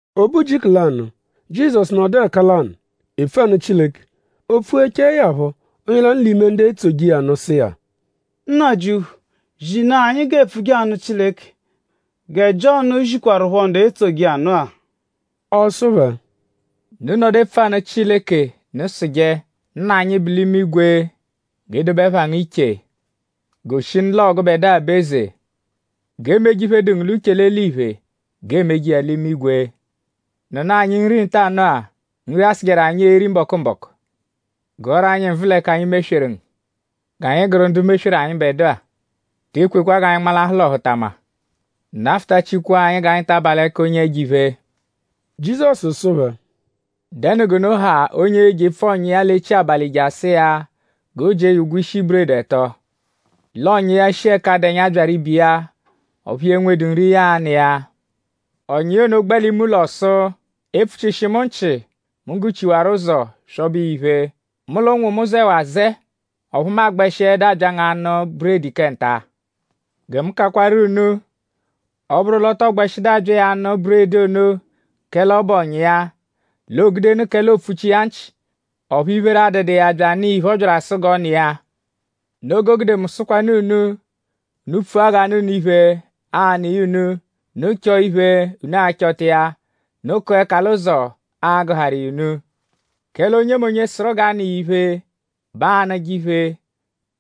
O be ujiku lanụ; Jizọsu nọdu ẹka lanụ epfu anụ Chileke. O pfughechaẹ ya phọ; onye lanụ l'ime ndu etsoje iya nụ sụ iya: “Nnajịuphu; zinaa anyi g'eepfuje anụ Chileke gẹ Jiọnu zikwarụpho ndu etsoje iya nụ-a.” Ọ sụ phẹ: “Unu -nọdu epfu anụ Chileke; unu sụje: “Nna anyi, bu l'imigwe; G'e dobe ẹpha ngu iche. Goshinu l'ọo gụbedua bụ eze. G'emeje iphe, dụ ngu l'uche l'eliphe; g'eemeje iya l'imigwe. Nụnu anyi nri ntanụ-a; Nri, a-sụjeru anyi eri mbọku-mbọku. Gụaru anyi nvụ l'ẹka anyi mesweru ngu. G'anyi gụru ndu mesweru anyịbedua. Te ekwekwa g'anyi nmalahụ l'ọhutama. Nafụtachikwaa anyi g'anyi ta aba l'ẹka onye ẹjo-iphe.” Jizọsu sụ phẹ: “Dẹnu g'unu ha onye e-jepfu ọ̀nyà iya l'echi abalị je asụ iya g'o jie ya ụgwo ishi buredi ẹto; l'ọ̀nyà iya, shi ẹka dụ ẹnya byaru ibe iya; ọphu ya enwedu nri, ya a-nụ iya. Ọ̀nyà iya ono gbẹ l'ime ụlo sụ: ‘E pfuchishi mu nchị! Mu gụ-chiwaru ụzo; swọbe iya iphe. Mu l'ụnwu mu zẹwaa azẹe. Ọphu mu agbẹshiedu abya ngu anụ buredi kẹ nta.’ Gẹ mu kakwaru unu: ọ -bụru l'ọ tọo gbẹshidu abya iya anụ buredi ono kẹle ọ bụ ọ̀nyà iya; l'oo-gudenụ kẹle oopfuchi iya nchị; ọphu iphere adụdu iya bya anụ iya iphe, ọ byaru asụ g'ọ nụ iya. Noo g'o gude mu sụkwanu unu; unu pfua g'a nụ unu iphe; aa-nụ iya unu! Unu chọo iphe; unu a-chọta iya! Unu kụa ẹka l'ụzo; aa-gụharu iya unu! Kẹle onyemonye, sụru g'a nụ iya iphe bẹ aa-nụje iphe;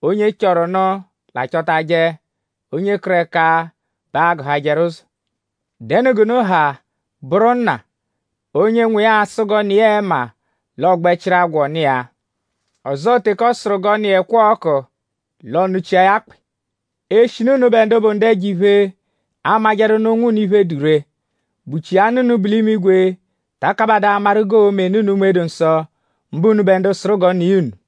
onye chọru nụ l'a-chọtaje; onye kụru ẹka bẹ aa-gụhajeru ụzo. ?Dẹnu g'unu ha, bụru nna, onye nwa iya a-sụ g'ọ nụ iya ẹma; l'ọ gbẹ chịru agwọ nụ iya; ọzoo teke ọ sụru g'ọ nụ iya ẹkwa-ọku; l'ọ nụchia ya akpị? Eshinu unubẹ ndu bụ ndu ẹjo-iphe amajẹru nụ ụnwu unu iphe, dụ ree;?bụchia Nna unu bu l'imigwe ta akabadaa amaru g'oo-me nụ unu Unme-dụ-Nsọ; mbụ unubẹ ndu sụru g'ọ nụ iya unu?”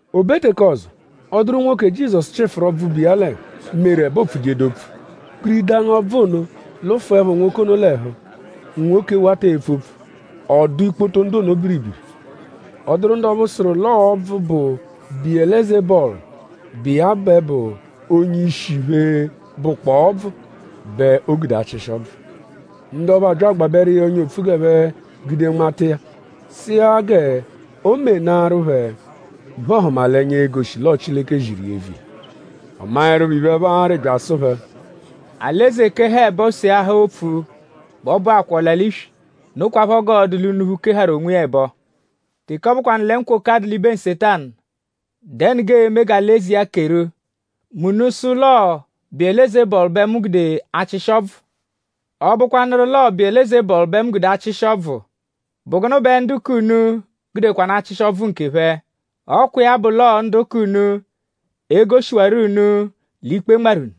O be teke ọzo; ọ dụru nwoke, Jizọsu chịfuru ọbvu, bu iya l'ẹhu, meru ẹbe oopfujedu opfu. Kpiridangu-ọbvu ono lụfuepho nwoke ono l'ẹhu; nwoke wata epfu opfu. Ọ dụ ikpoto ndu ono biribiri. Ọ dụru ndu ọphu sụru l'ọo ọbvu, bụ Biyelezebọlu, bụ iya bẹ bụ onye-ishi iphe, bụkpoo ọbvu bẹ o gude achịshi ọbvu. Ndu ọphu abya agbabẹru iya ọ́nyà opfu g'ẹphe gude nmata iya; sụ iya g'o menaarụ phẹ iphe-ọhumalenya, e-goshi l'ọo Chileke ziru iya eviya. Ọ maẹrupho iphe, ẹphe arị bya asụ phẹ: “Alị-eze -keha ẹbo; seahaa opfu bẹ ọ bụakwaa ọla-l'iswi. Nokwaphọ g'ọo-dụ l'unuphu, keharu onwiya ẹbo. Teke ọ bụkwanu lẹ nkwoka dụ l'ibe Nsetanu;?dẹnu g'ee-me g'alị-eze iya keru; mẹ unu -sụ l'ọo Biyelezebọlu bẹ mu gude achịshi ọbvu? Ọ -bụkwanuru l'ọo Biyelezebọlu bẹ mu gude achịshi ọbvu;?bụ gụnu bẹ ndu k'unu gudekwanụ achịshi ọbvu nkephẹ? Ọ kwa iya bụ l'ọo ndu k'unu e-goshiwarọ unu l'ikpe nmarụ unu.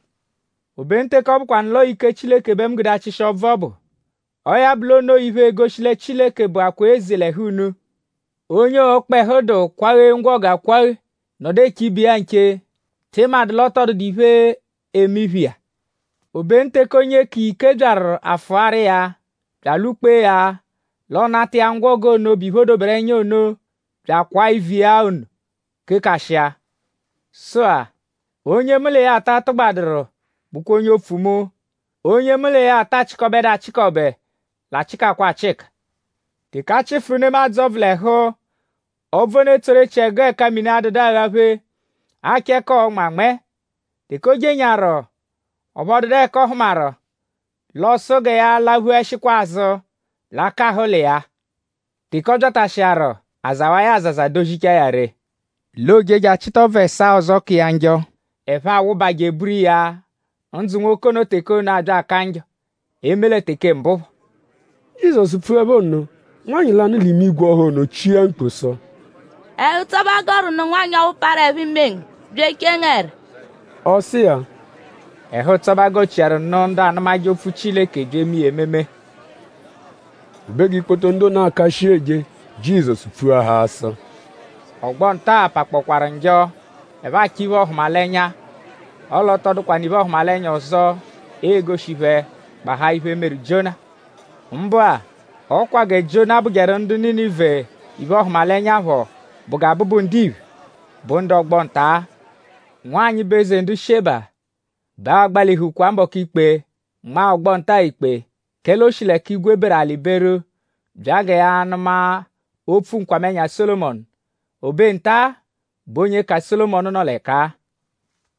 Obenu teke ọ bụkwanu l'ọo ike Chileke bẹ mu gude achịshi ọbvu ọbu; ọo ya bụ l'o noo iphe, egoshi lẹ Chileke bụakwaa eze l'ẹhu unu. “Onye ọkpehu dụ -kwaghe ngwọgu akwaghe nọdu eche ibe iya nche;?tị madụ l'ọ tọ dụdu iphe, eme iphe iya? Obenu teke onye ka iya ike byaru afụaru iya; bya alwụ-kpee ya l'ọ nata iya ngwọgu ono, bụ iphe, o doberu ẹnya ono; bya akwaa ivu iya ono kekashịa. “Sụ-a; onye mu l'iya ata tụgbaduru bụkwa onye opfu mu; onye mu l'iya ata achịkobedu achịkobe l'achịkakwa achịka. “Teke a chịfuru nemadzụ ọbvu l'ẹhu; ọbvu ono etsoru echiẹgu ẹka mini adụdu aghaphe; achọ ẹka ọo-nmẹ anmẹe. Teke o jenyaaru; ọphu ọ dụdu ẹka ọ hụmaru; l'ọ sụ gẹ ya laphuẹshikwa azụ l'akahụ ụlo iya-a. Teke ọ byatashịaru; a zawa iya azaza; dozichaa ya ree; l'o je je achịta ọbvu ẹsaa ọzo, ka iya njọ; ẹphe awụba je eburu iya; ndzụ nwoke ono teke ono abya aka njọ; eme lẹ teke mbụ phọ.” Jizọsu pfuẹpho nno; nwanyị lanụ l'ime igwe ọha ono chia mkpu sụ: “Ẹhu-ụtso bẹ a gọru nụ nwanyị ọphu parụ ẹpho-ime ngu bya echee ngu ẹra!” Ọ sụ iya: “Ẹhu-ụtso bẹ gọchiaru nụ ndu anụmaje opfu Chileke bya eme iya ememe!” O be g'ikpoto ndu ono aka shii eje; Jizọsu pfuahaa sụ: “Ọgbo-nta-a pakpọkwaaru njọ. Ẹphe achọ iphe-ọhumalenya. Ọle ọ tọ dụkwanu iphe-ọhumalenya ọzo, ee-goshi phẹ; gbahaa iphe, meru Jiona. Mbụ-a; ọo kwa gẹ Jiona bụjeru ndu Ninive iphe-ọhumalenya phọ bụ gẹ Abụbu-Ndiphe bụ ndu ọgbo-nta-a. Nwanyị, bụ eze ndu Sheba bẹ a-gbalihu mbọku ikpe; nma ọgbo-nta-a ikpe; kẹle o shi l'ẹka igwe beru; alị beru bya gẹ ya nụma opfu nkwamẹnya Sólomọnu. O be nta-a bẹ onye ka Sólomọnu nọ l'ẹka-a.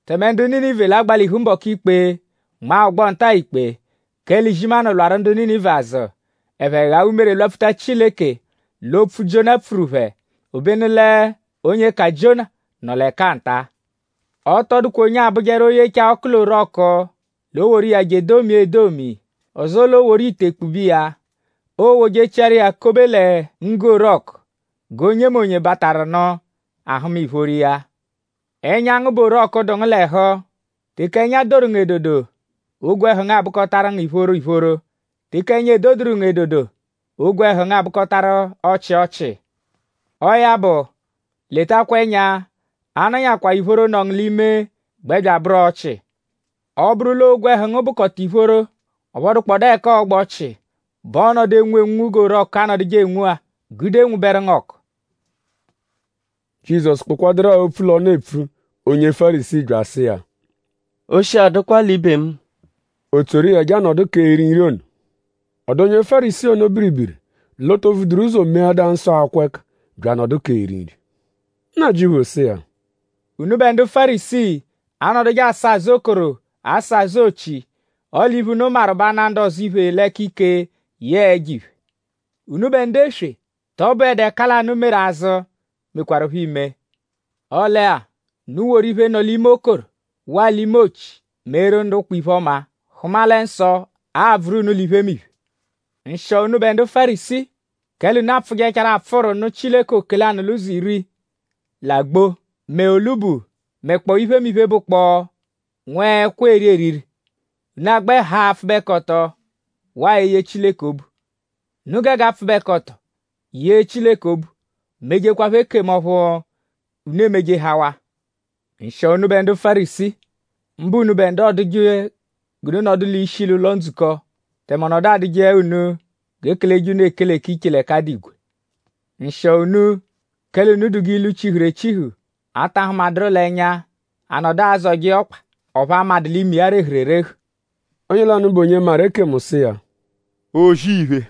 Tẹme ndu Ninive l'a-gbalihu mbọku ikpe; nma ọgbo-nta-a ikpe; kẹle izimanụ lwarụ ndu Ninive azụ; ẹphe ghaa umere; lwapfuta Chileke l'opfu, Jiona pfuru phẹ; obenu l'onye ka Jiona nọ l'ẹka-a nta.” “Ọ tọ dụkwa onye abụjeru; ọ -yechaa ọku l'orọku l'o woru iya je edomia edomi; ọzoo l'o woru ite kpube iya. Oowojechiaru iya kobe lẹ nggu-orọku g'onyemonye, bataru nụ ahụma ìphóró iya. Ẹnya ngu bụ orọku, dụ ngu l'ẹhu. Teke ẹnya doru ngu edodo; ogwẹhu ngu abụkotaru ngu ìphóró ìphóró. Teke ẹnya edoduru ngu edodo; ogwẹhu ngu abụkotaru ọchii ọchii. Ọo ya bụ; letakwa ẹnya; a -nọnyakwaa ìphóró, nọ ngu l'ime gbẹ bya abụru ọchii. Ọ -bụru l'ogwẹhu ngu bụkota ìphóró; ọphu ọ dụkpodaa ẹka ọogba ọchii; bẹ ọo-nọdu enwu enwunwu g'orọku anọduje enwu-a gude nwụberu ngu ọku.” Jizọsu kpụkwadurua opfu l'ọnu epfu; onye Fárisii bya asụ iya: “Oshi adụkwa l'ibe mu.” O tsoru iya je anọdu k'eri nri ono. Ọ dụ onye Fárisii ono biribiri l'o to vuduru ụzo meadaa nsọ akwọ ẹka; bya anọdu k'eri nri. Nnajịuphu sụ iya: “Unubẹ ndu Fárisii anọduje asa azụ okoro asa azụ ochi; ọle iphe, unu maru bụ ana ndu ọzo iphe l'ẹka ike yẹe ẹjo-iphe. Unubẹ ndu eswe!?Tọ bụedu ẹka lanụ, meru azụ, mekwarụpho ime? Ọle-a; unu woru iphe, nọ l'ime okoro waa l'ime ochi meeru ndu ụkpa iphe-ọma; hụma lẹ nsọ a-bvụru unu l'iphemiphe. “Nshịo unubẹ ndu Fárisii; kẹle unu apfụjechaaru apfụru nụ Chileke oke-lanụ-l'ụzo-iri: l'agbo; mẹ olubu; mẹkpoo iphemiphe, bụkpoo nwẹekwo, eeri eriri; unu agbẹ haa apfụbekoto waa eye Chileke obu. Unu gege apfụbekoto; yee Chileke obu; mejekwaphọ ekemu ọphu unu emejehawaa. “Nshịo unubẹ ndu Fárisii; mbụ unubẹ ndu ọoduje g'unu nọdu l'ishi l'ụlo-ndzukọ; tẹme ọ nọdu adụje unu g'e keleje unu ekele k'iche l'ẹka a dụ igwe. Nshịo unu; kẹle unu dụ g'ilu, chihuru echihu, a ta hụmaduru l'ẹnya; a nọdu azọje iya ọkpa; ọphu a madụ l'ime iya rehuru erehu.” Onye lanụ bụ onye maru ekemu sụ iya: “O-zì-iphe;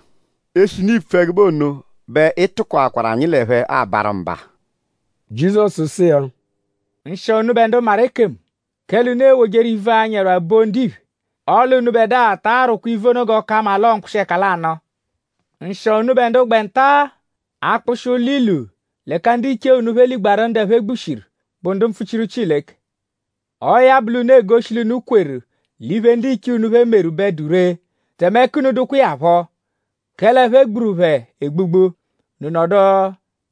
eshinu iipfu ẹgube ono bẹ ị tụkoakwaru anyi l'ẹphe abarụ mba.” Jizọsu sụ iya: “Nshịo unubẹ ndu maru ekemu; kẹle unu ewojeru ivu, anyi ẹrwa boo ndiphe; ọle unubẹdua ta arwụkwa ivu ono g'ọ ka mma l'ọo mkpụshi-ẹka lanụ. Nshịo unubẹ ndu gbẹ nta-a akpụshi ụlo-ilu l'ẹka ndiche unu phẹ ligbaaru ndu ẹphe gbushiru, bụ ndu mpfuchiru Chileke. Ọo ya bụ l'unu egoshi l'unu kweru l'iphe, ndiche unu phẹ meru bẹ dụ ree; tẹme ẹka unu dụkwa iya phọ; kẹle ẹphe gburu phẹ egbugbu; unu nọdu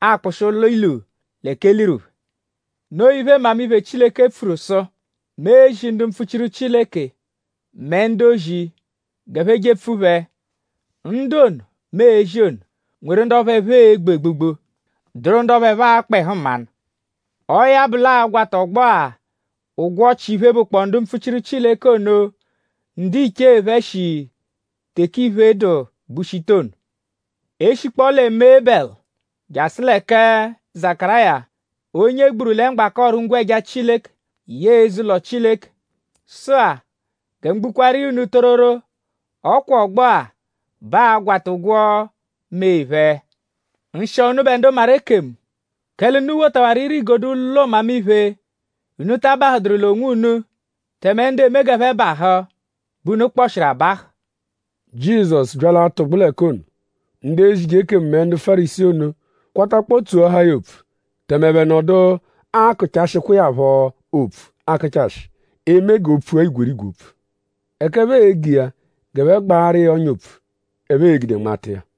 akpụshi ụlo-ilu l'ẹka e liru phẹ. Noo iphe, Mmamiphe Chileke pfuru sụ: ‘Mu e-zi ndu mpfuchiru Chileke; mẹ ndu-ozi g'ẹphe jepfu phẹ. Ndu ono, mu e-zi ono nweru ndu ọphu ẹphe e-gbu egbugbu; dụru ndu ọphu ẹphe a-kpa ẹhu mmanụ.’ Ọo ya bụ l'aa-gwata ọgbo-a ụgwo ọchi iphe, bụkpoo ndu mpfuchiru Chileke ono, ndiche phẹ shi teke ìphè dụ gbushita ono; e -shikpọo lẹ mee Ebẹlu jasụ lẹ kẹ Zakaráya, onye e gburu lẹ mgbaka ọru-ngwẹja Chileke yẹe eze-ụlo Chileke. Sụ-a; gẹ mu gbukwaaru iya unu tororo; ọ kwa ọgbo-a bẹ aa-gwata ụgwo mee phẹ. “Nshịo unubẹ ndu maru ekemu; kẹle unu wotawaru ire-igodo ụlo mmamiphe. Unu ta abahụduru l'onwunu; tẹme ndu eme g'ẹphe bahụ bẹ unu kpọshiru abahụ.” Jizọsu bya l'atụgbu l'ẹka ono; ndu ezije ekemu mẹ ndu Fárisii ono kwatakpọo tsoahaa ya opfu; tẹme ẹphe nọdu akụchashikwa iya phọ opfu akụchashi; eme g'o pfua igwerigwe opfu; ẹka ẹphe ege iya g'ẹphe gbaaru iya ọ́nyà opfu, ẹphe e-gude nmata iya.